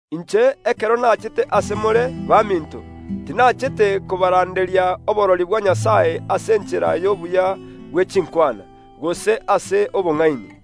Inche, ekero nachete ase more, baminto, tinachete kobaranderia oborori bwa Nyasae ase enchera y’obuya bwe chinkwana, gose ase obong’aini.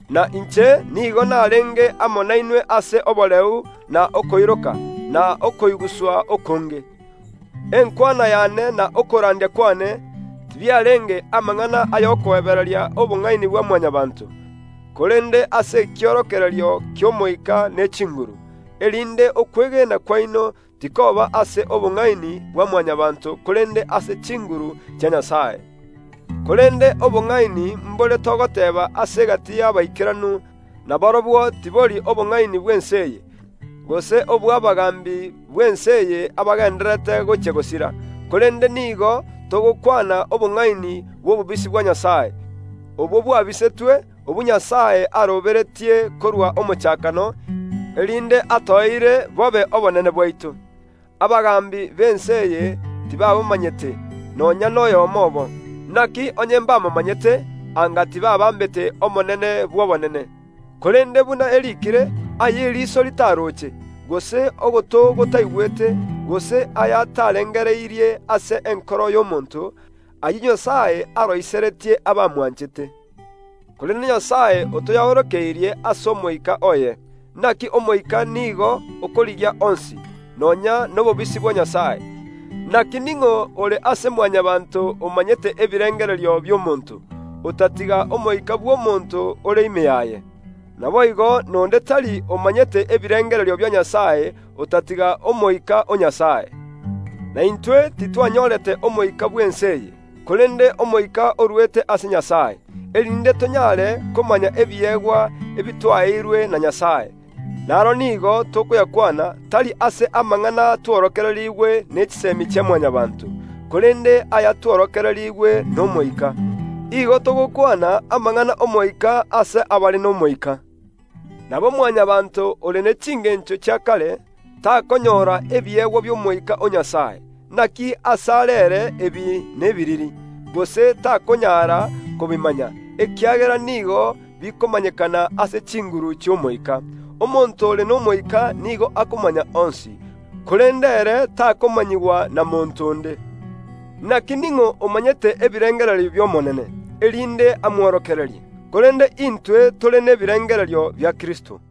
Na inche nigo narenge amo nainwe ase oboreu na okoiroka, na okoiguswa. Enkwana yane na okorandia kwane tibiarenge amang’ana ay’okoebereria obong’aini bwa Mwanyabaanto, korende ase ekiorokererio ki’Omoika ne chinguru, erinde okwegena kwaino tikoba ase obong’aini bwa Mwanyabaanto korende ase chinguru chia Nyasae. Korende obong’aini mbore togoteeba ase egati y’abaikeranu, na borobwo tibori obong’aini bw’ense eye, gose obw’abagaambi b’ense eye abagendererete gochia gosira, korende nigo togokwana obong’aini bw’obobisi bwa Nyasae, obwo bwabisetwe, obwo Nyasae aroberetie korwa omochakano, erinde toegwe bobe obonene bwaito. Abagaambi b’ense eye tibabomanyete, nonya noyomo obo; naki onye mbabomanyete, anga tibaabambete Omonene bw’obonene; korende buna eriikire, “Aya eriso ritaroche, gose ogoto gotaigwete, gose aya atarengereirie ase enkoro y’omonto, ayio Nyasae aroiseretie abamwanchete.” Korende Nyasae otoyaorokeirie ase Omoika oye, naki Omoika nigo okorigia onsi, nonya nobobisi bwa Nyasae. Naki ning’o ore ase Mwanyabaanto omanyete ebirengererio bi’omonto, otatiga omoika bw’omonto ore ime yaye? Naboigo nonde tari omanyete ebirengererio bia Nyasae otatiga Omoika o Nyasae. Na intwe titwanyorete omoika bw’ense eye, korende Omoika orwete ase Nyasae, erinde tonyare komanya ebiegwa ebitwaeirwe na Nyasae. Naro nigo tokoyakwana, tari ase amang’ana tworokererigwe ne chisemi chia Mwanyabaanto, korende aya tworokererigwe n’Omoika; igo togokwana amang’ana ’Omoika ase abare n’Omoika. Nabo Mwanyabaanto ore ne chingencho chia kare, takonyora ebiegwa bi’Omoika o Nyasae, naki asare ere ebi nebiriri, gose takonyara kobimanya, ekiagera nigo bikomanyekana ase chinguru chi’Omoika. Omonto ore n’Omoika nigo akomanya onsi, korende ere takomanyigwa na monto onde. “Naki ning’o omanyete ebirengererio bi’Omonene, erinde amworokererie?” Korende intwe ntore nebirengererio bia Kristo.